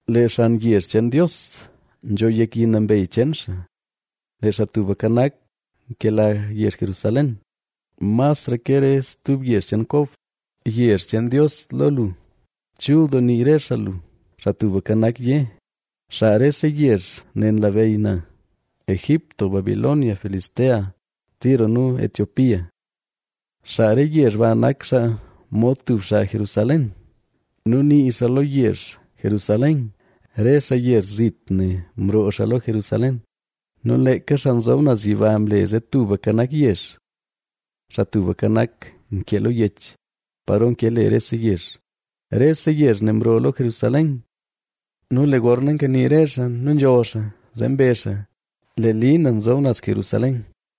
Lee xan yezh cheen Dios, nzho yek yi nambey cheen xaa. Lee Xaa Tubka Nak, nkela yezh Jerusalén, masra ke re stub yezh cheen Kob. Yezh cheen Dios lo lu, chul doo nii re xaa lu. Xaa Tubka Nak yé: “Xaa rese yezh ne nlabeyy na: Egipto, Babilonia, Filistea, Tiro nu Etiopía. ¡Xaa re yezh ba nak xaa mod tub xaa Jerusaléna!” Nu nii xaa lo yezh Jerusalén: “Re xaa yezh zit ne mroo xaa lo Jerusalén.” Nu leeka Xaa Nzob Naz Yiba mle zee tuka nak yezh. Xaa Tubka Nak nkee lo yech, paro nke le rese yezh: “Rese yezh ne mroo lo Jerusalén.” Nu lee gorna nkani re xaa nu nzholl xaa, zee mbezh xaa: “Lee li na nzob naz Jerusalén.”